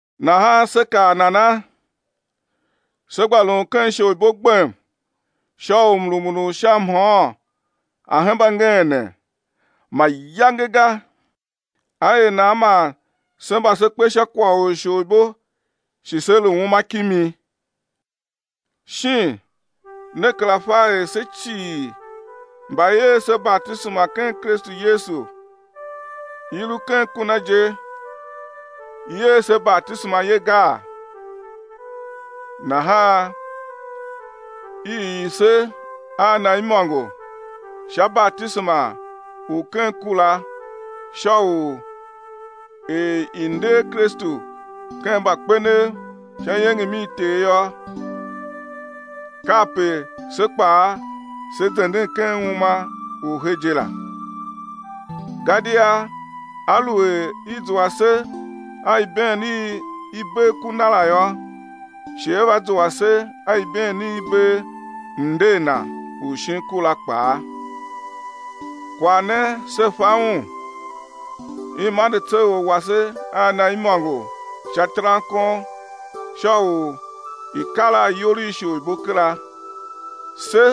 Nahan sé kaa nana? Sé gba lun ken isholibo gbem sha u mrumun u sha mhôôn a̱ hemba ngeene? Mayange ga! Á er nan man se mba se kpe sha kwagh u isholibo shi sé lu uma kimi? Shin ne kera fa er se cii mba i er se batisema ken Kristu Yesu, i lu ken ku Na je i er se batisema ye gaa? Nahan i ii se a Na imôngo sha batisema u ken ku la sha u er i nder Kristu ken mbakpenev sha iengem i Ter yô, kape se kpaa se zenden ken uma u he je la. Gadia aluer i zua se a ibeen i i bee ku Na la yô, shi á va zua se a ibeen i i bee mnder Na u shin ku la kpaa. Kwagh ne se fa un, i mande tseor wase a Na imôngo sha terankon sha u i̱ kar a iyol i isholibo kera, se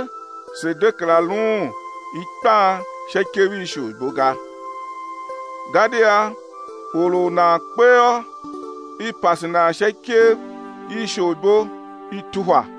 se̱ de kera luun ikpan sha ikev i isholibo ga. Gadia or u nan kpe yô, i pase nan sha ikev i isholibo i tuhwa.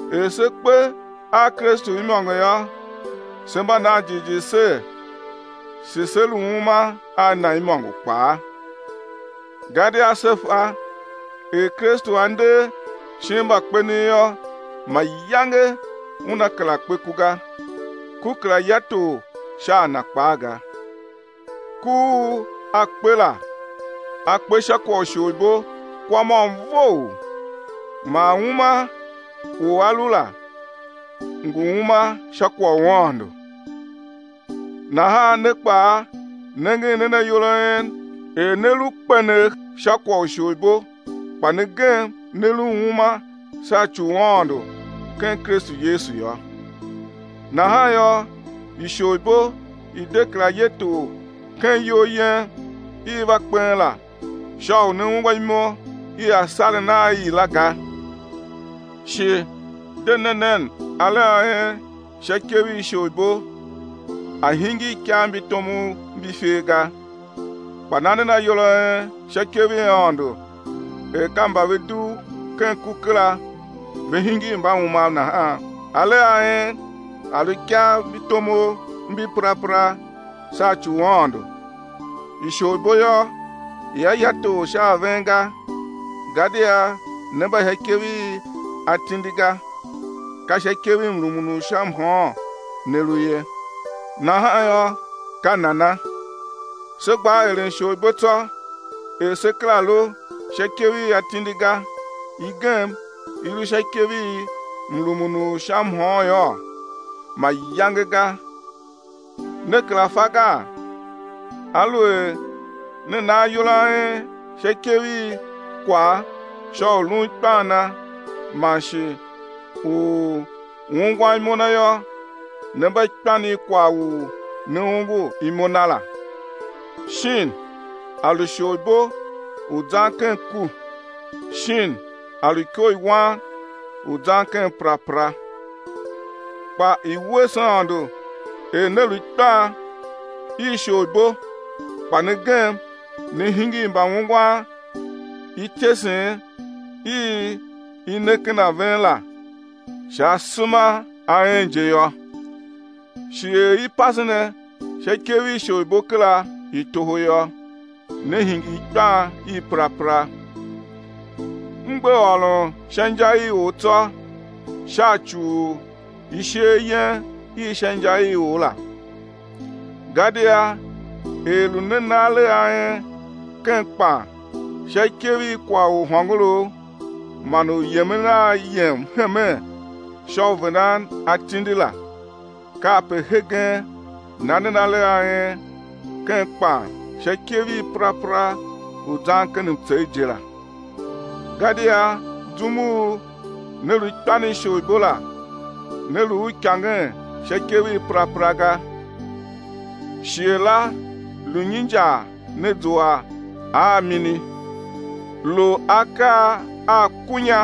Er se kpe a Kristu imôngo yô, se mba nan jighjigh ser, shi sé lu uma a Na imôngo kpaa. Gadia se fa, er Kristu A nder shin mbakpenev yô, mayange Una kera kpe ku ga, ku kera ya tor sha a Na kpaa ga. Ku u A kpe la, A kpe sha kwagh u isholibo kwa môm vough, man uma u A lu la, ngu uma sha kwagh u Aôndo. Nahan ne kpaa, nengen nen ayol a en er ne lu kpenegh sha kwagh u isholibo kpa ne gem ne lu uma sha ci u Aôndo ken Kristu Yesu yô. Nahan yô, isholibo i̱ de kera ye tor ken iyol yen i va kpen la sha u né ungwa imo i asaren a i la ga, shi de ne nen alegh a en sha ikev i isholibo a̱ hingir ikav mbi tomov mbi ifer ga, kpa na nen ayol a en sha ikev i Aôndo er ka mba ve dugh ken ku kera ve hingir mbaumav nahan, alegh a en a̱ lu ikav mbi tomov mbi perapera sha ci u Aôndo. Isholibo yô, ia ya tor sha a ven ga, gadia ne mba sha ikev i atindi ga, ka sha ikev i mrumun u sha mhôôn ne lu ye. Nahan yô, ka nana? Sé gbaa eren isholibo tsô er se kera lu sha ikev i atindi ga, i gem i lu sha ikev i mrumun u sha mhôôn yôô? Mayange ga. Ne kera fa gaa? Aluer ne na ayol a en sha ikev i kwagh sha u lun ikpan na man shi u ungwan imo na yô, ne mba ikpan i kwagh u ne ongo imo na la, shin a lu isholibo u zan ken ku, shin a lu iko i wan, u zan ken perapera. Kpa i̱ wuese Aôndo er ne lu ikpan i isholibo kpa ne gem ne hingir mbaungwan ityesen i i ne ken ven la sha asema a en je yô. Shi er i pase ne sha ikev i isholibo kera i toho yô, ne hingir ikpan i perapera. M gbe ôron sha inja i or tsô sha ci u isheer yen i sha inja i or la. Gadia er lu ne na alegh a en ken kpan sha ikev i kwagh u hôngorough man u yemen a yem hemen sha u vendan atindi la, kape hegen na nen alegh a en ken kpan sha ikev i perapera u zan ken mtsegh je la. Gadia zum u ne lu ikpan i isholibo la ne lu uikangen sha ikev i perapera ga. Shighe la lu nyi injar ne zua a mini? Lu akaa a kunya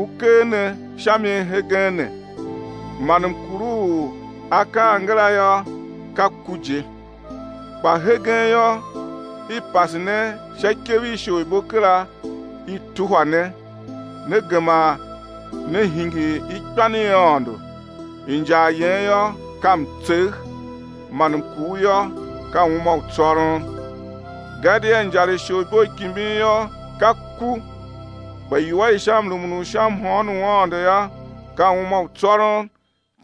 u ker ne sha mi hegen ne. Man mkur u akaa angara yô, ka ku je. Kpa hegen yô, i pase ne sha ikev i isholibo kera i tuhwa ne, ne gema ne hingir ikpan i Aôndo, injar yen yô, ka mtsegh, man mkur yô, ka uma u tsôron. Gadia injar i isholibo i kimbin yô, ka ku, kpa iwua i sha mrumun u sha mhôôn u Aôndo yô, ka uma u tsôron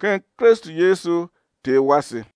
ken Kristu Yesu Ter wase.